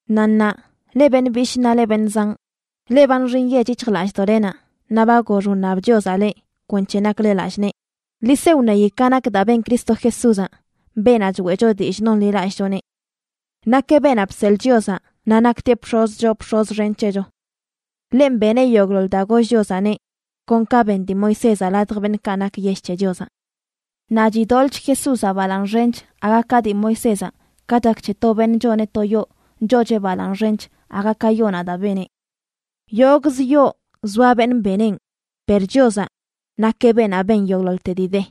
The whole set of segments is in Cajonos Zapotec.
Naꞌ ṉaa, leꞌ beṉꞌ bishꞌ naꞌ leꞌ beṉꞌ zanꞌ, leꞌ ba nxi nyech yic̱hjlallꞌdoꞌlenaꞌ naꞌ ba gox wṉab Chiozaꞌ leꞌ kwenc̱he nakle lallꞌ nee, ḻi se wṉeyi ka nak daa ben Cristo Jesúzaꞌ, beenaꞌ choeꞌcho dillꞌ nonḻilallꞌchoneꞌ. Nakeꞌ beenaꞌ bseḻꞌ Chiozaꞌ naꞌ naktieꞌ bx̱oz choo bx̱oz xen c̱hecho. Ḻenꞌ beneꞌ yogꞌḻoḻ daa goll Chiozaꞌneꞌ, kon ka ben dii Moisézaꞌ ladj beṉꞌkaꞌ nak yell c̱he Chiozaꞌ. Naꞌ chidoḻꞌch Jesúzaꞌ balaaṉ xench aga ka dii Moisézaꞌ, ka chak c̱he to beṉꞌ choneꞌ to yoo choocheꞌ balaaṉ xench aga ka yoonaꞌ daa beneꞌ. Yogꞌz yoo zoa beṉꞌ beneꞌn, per Chiozaꞌ nakeꞌ beenaꞌ ben yogꞌḻoḻte dii de.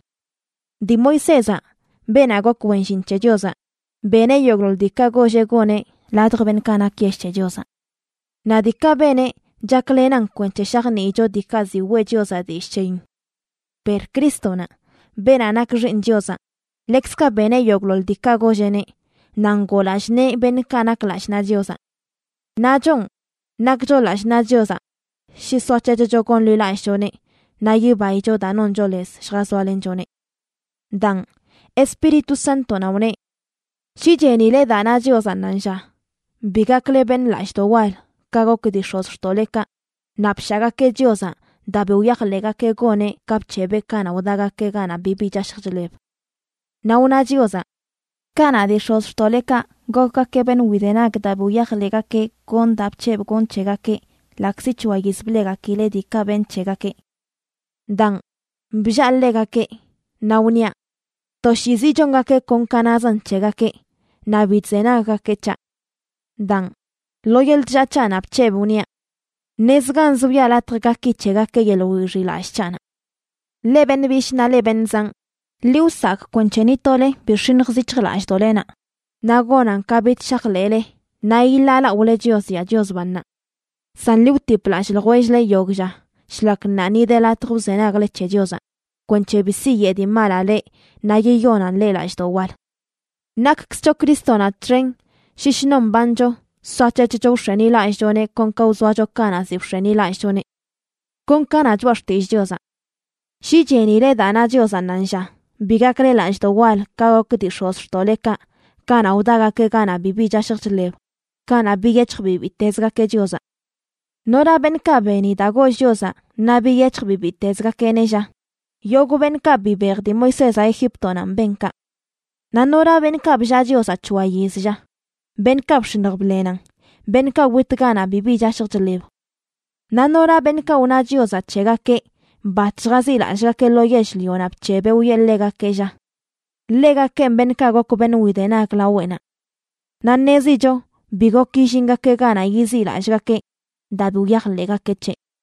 Dii Moisézaꞌ, beenaꞌ gok wen llin c̱he Chiozaꞌ, beneꞌ yogꞌḻoḻ diikaꞌ golleꞌ goneꞌ ladj beṉꞌkaꞌ nak yell c̱he Chiozaꞌ. Naꞌ diikaꞌ beneꞌ chaklenan kwenc̱he shajniicho diikaꞌ ziꞌ weꞌ Chiozaꞌ dillꞌ c̱heyin. Per Crístonaꞌ, beenaꞌ nak Xiiṉ Chiozaꞌ, ḻekzkaꞌ beneꞌ yogꞌḻoḻ diikaꞌ golleꞌneꞌ, naꞌ ngoo lallꞌ nee beṉꞌkaꞌ nak lallꞌ naꞌ Chiozaꞌ. Naꞌ chonꞌ, nakcho lallꞌ naꞌ Chiozaꞌ shi soac̱hec̱hcho gonḻilallꞌchoneꞌ naꞌ yibaicho daa noncho lez lljazoalenchoneꞌ. Daan, Espíritu Sántonaꞌ wneꞌ: Shi chenile daa na Chiozaꞌ ṉaanlla, bi gakle beṉꞌ lallꞌdoꞌ wal ka gok dii x̱ozxtoꞌlekaꞌ naꞌ bshaagakeꞌ Chiozaꞌ daa bi wyajḻeꞌgakeꞌ goneꞌ ka bc̱hebeꞌ kanaꞌ wdagakeꞌ ganaꞌ bibi chashj chḻeb. Naꞌ wna Chiozaꞌ: Kanaꞌ dii x̱ozxtoꞌlekaꞌ gokgakeꞌ beṉꞌ widenag daa bi wyajḻegakeꞌ gonꞌ daa bc̱hebꞌ gonꞌ c̱hegakeꞌ, ḻaꞌkzi c̱hoa yiz bleꞌgakileꞌ diikaꞌ benꞌ c̱hegakeꞌ. Daan, bllaa ḻegakeꞌ, naꞌ wniaꞌ: “Toshiizi chongakeꞌ kon ka nazan c̱hegakeꞌ, naꞌ bi chzenaggakeꞌ c̱haꞌ.” Daan, lo yeḻꞌ chllaa c̱haꞌnaꞌ bc̱hebꞌ, wniaꞌ: Ṉezganz wiꞌa latj gaki c̱hegakeꞌ yeḻꞌ wixiꞌlallꞌ c̱haꞌnaꞌ. Leꞌ beṉꞌ bishꞌ naꞌ leꞌ beṉꞌ zanꞌ, ḻi wsakꞌ kwenc̱he ni tole bi x̱iṉjz yic̱hjlallꞌdoꞌlenaꞌ naꞌ gonan ka bich shajḻeꞌle naꞌ yiḻaalaꞌole Chios yaa Chios bannaꞌ. San ḻi wtip lallꞌ ljwell-le yogꞌ lla shlak ṉaa ni de latj wzenagle c̱he Chiozaꞌ, kwenc̱he bi siyeꞌ dii malaꞌ leꞌ naꞌ yiyonan leꞌ lallꞌdoꞌ wal. Nakkzcho Crístonaꞌ txen shi shnon mbancho soac̱hec̱hcho wx̱enilallꞌchoneꞌ kon ka wzoacho kanaꞌ ziꞌ bx̱enilallꞌchoneꞌ. Kon ka na Choꞌa Xtillꞌ Chiozaꞌ: Shi chenile daa na Chiozaꞌ ṉaanlla, bi gakle lallꞌdoꞌ wal ka gok dii x̱ozxtoꞌlekaꞌ kanaꞌ wdagakeꞌ ganaꞌ bibi chashj chḻeb, kanaꞌ biyec̱hj bibiitezgakeꞌ Chiozaꞌ. ¿Nora beṉꞌkaꞌ beni daa goll Chiozaꞌ naꞌ biyec̱hj bibiitezgakeꞌneꞌ, lla? Yogꞌ beṉꞌkaꞌ bibej dii Moisézaꞌ Egíptonanꞌ ben kaꞌ. Naꞌ ¿nora beṉꞌkaꞌ bllaa Chiozaꞌ c̱hoa yiz, lla? Beṉꞌkaꞌ bx̱iṉj bḻenan, beṉꞌkaꞌ wit ganaꞌ bibi chashj chḻeb. Naꞌ ¿nora beṉꞌkaꞌ wna Chiozaꞌ c̱hegakeꞌ bat lljaziꞌlallꞌgakeꞌ lo yell-lionaꞌ bc̱hebeꞌ wiꞌe ḻegakeꞌ, lla? Ḻegakenꞌ beṉꞌkaꞌ gok beṉꞌ widenag laweꞌnaꞌ. Naꞌ ṉezicho bi gok yillingakeꞌ ganaꞌ yiziꞌlallꞌgakeꞌ daa bi wyajḻeꞌgakeꞌ c̱heꞌ.